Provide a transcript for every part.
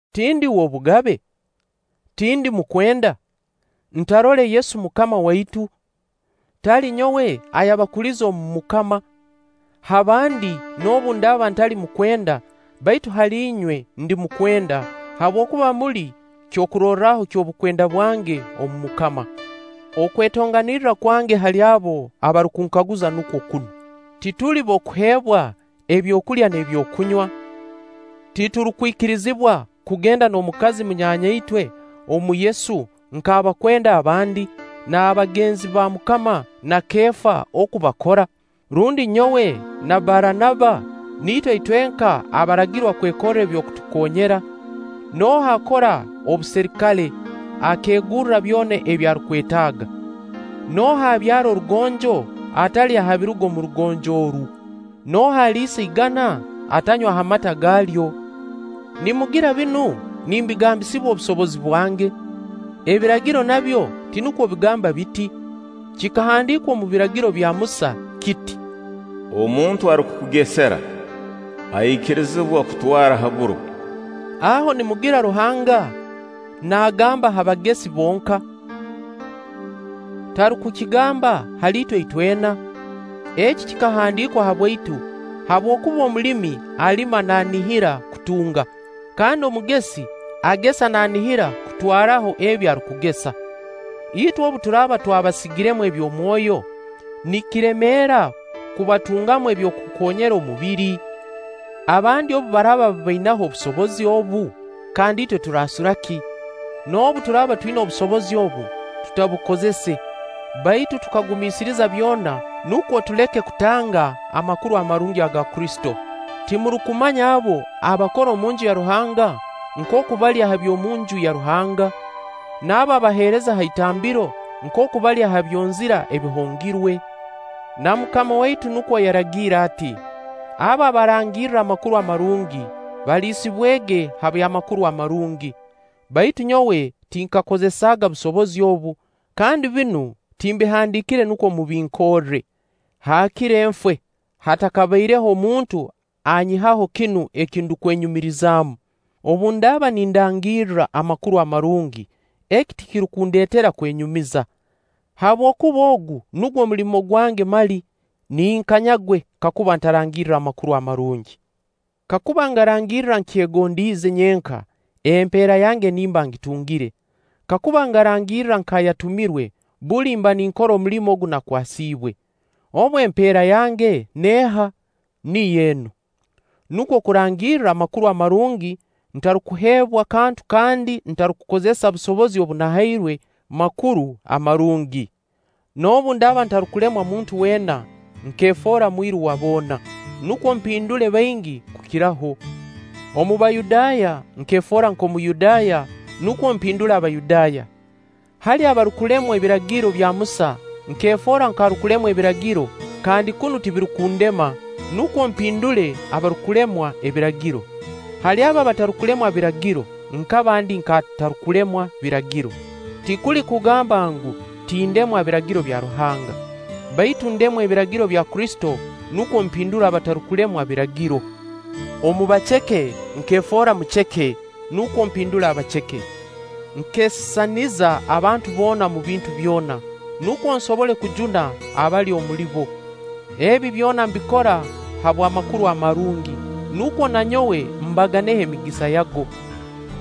Tindi w'obugabe? Tindi mukwenda? Ntarole Yesu Mukama waitu? Tali nyowe ayabakulize omu MUKAMA? Ha bandi noobu ndaaba ntali mukwenda, baitu hali inywe ndi mukwenda; habwokuba muli kyokurorraho ky'obukwenda bwange omu MUKAMA. Okwetonganirra kwange hali abo abarukunkaguza nukwo kunu: Tituli b'okuheebwa ebyokulya n'ebyokunywa? Titurukwikirizibwa kugenda n'omukazi munyaanyaitwe omu Yesu nk'abakwenda abandi, n'abagenzi ba MUKAMA na Keefa oku bakora? Rundi nyowe na Baranaba niitwe itwenka abaragirwa kwekorra eby'okutukoonyera? Nooha akora obuserikale, akeegurra byona ebi arukwetaaga? Nooha abyara orugonjo, atalya ha biruga omu rugonjo oru? Nooha aliisa igana, atanywa ha mata gaalyo? Nimugira binu nimbigambisibwa obusobozi bwange? Ebiragiro nabyo tinukwo bigamba biti? Kikahandiikwa omu Biragiro bya Musa kiti: “Omuntu arukukugesera, aikirizibwa kutwara ha buro.” Aho nimugira Ruhanga naagamba ha bagesi bonka? Tarukukigamba hali itwe itwena? Eki kikahandiikwa habwaitu, habwokuba omulimi alima naanihira kutunga, kandi omugesi agesa naanihira kutwaraho ebi arukugesa. Itwe obu turaaba twabasigiremu eby'omwoyo, nikiremeera kubatungamu eby'okukoonyera omubiri? Abandi obu baraaba babainaho obusobozi obu, kandi itwe turaasura ki? Noobu turaaba twina obusobozi obu, tutabukozese; baitu tukagumiisiriza byona nukwo tuleke kutanga Amakuru Amarungi aga Kristo. Timurukumanya abo abakora omunju ya Ruhanga nkooku balya ha by'omu Nju ya Ruhanga? N'abo abaheereza ha Itambiro nkooku balya ha byonzira ebihongerwe? Na MUKAMA waitu nukwo yaragiire ati: Abo abarangirra Amakuru Amarungi, baliisibwege ha by'Amakuru Amarungi. Baitu nyowe tinkakozesaaga busobozi obu, kandi binu timbihandiikire nukwo mubinkorre. Haakire nfe, hatabaireho muntu anyihaho kinu eki ndukwenyumirizaamu. Obu ndaaba nindangirra Amakuru Amarungi, eki tikirukundeetera kwenyumiza. Habwokuba ogu nugwo mulimo gwange mali. Ninkanyagwe kakuba ntarangirra Amakuru Amarungi! Kakuba ngarangirra nkyegondiize nyenka, empeera yange nimba ngitungire; kakuba ngarangirra nk'ayatumirwe, buli mba ninkora omulimo ogu nakwasiibwe. Obu, empeera yange neeha? Niyo enu: Nukwo kurangirra Amakuru Amarungi ntarukuheebwa kantu kandi ntarukukozesa busobozi obu nahairwe Makuru Amarungi. Noobu ndaaba ntarukulemwa muntu weena, nkeefoora mwiru wa boona, nukwo mpindule baingi kukiraho. Omu Bayudaaya nkeefoora nk'Omuyudaaya nukwo mpindule Abayudaaya. Hali abarukulemwa Ebiragiro bya Musa nkeefoora nk'arukulemwa Ebiragiro-kandi kunu tibirukundema-nukwo mpindule abarukulemwa Ebiragiro. Hali abo abatarukulemwa Biragiro, nkaba ndi nk'atarukulemwa Biragiro-tikuli kugamba ngu, tindemwa Biragiro bya Ruhanga, baitu ndemwa ebiragiro bya Kristo nukwo mpindule abatarukulemwa Biragiro. Omu baceke nkeefoora muceke, nukwo mpindule abaceke. Nkeesisaniza abantu boona omu bintu byona, nukwo nsobole kujuna abamu omuli bo. Ebi byona mbikora habw'Amakuru Amarungi, nukwo na nyowe mbaganeho emigisa yago.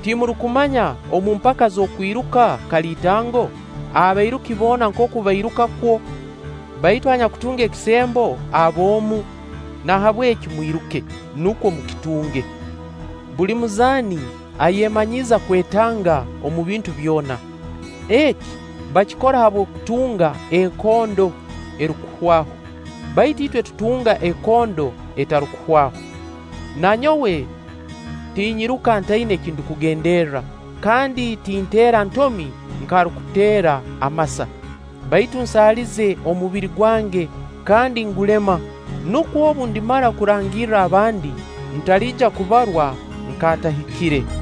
Timurukumanya omu mpaka z'okwiruka kaliitango, abairuki boona nkooku bairuka kwo; baitu anyakutunga ekisembo aba omu? Nahabweki mwiruke, nukwo mukitunge. Buli muzaani ayemanyiiza kwetanga omu bintu byona. Eki, bakikora habw'okutunga ekondo erukuhwaho, baitu itwe tutunga ekondo etarukuhwaho. Na nyowe tinyiruka ntaina eki ndukugenderra, kandi tinteera ntomi nk'arukuteera amasa; baitu nsaalize omubiri gwange, kandi ngulema, nukwo obu ndimara kurangirra abandi, ntaliija kubarwa nk'atahikire.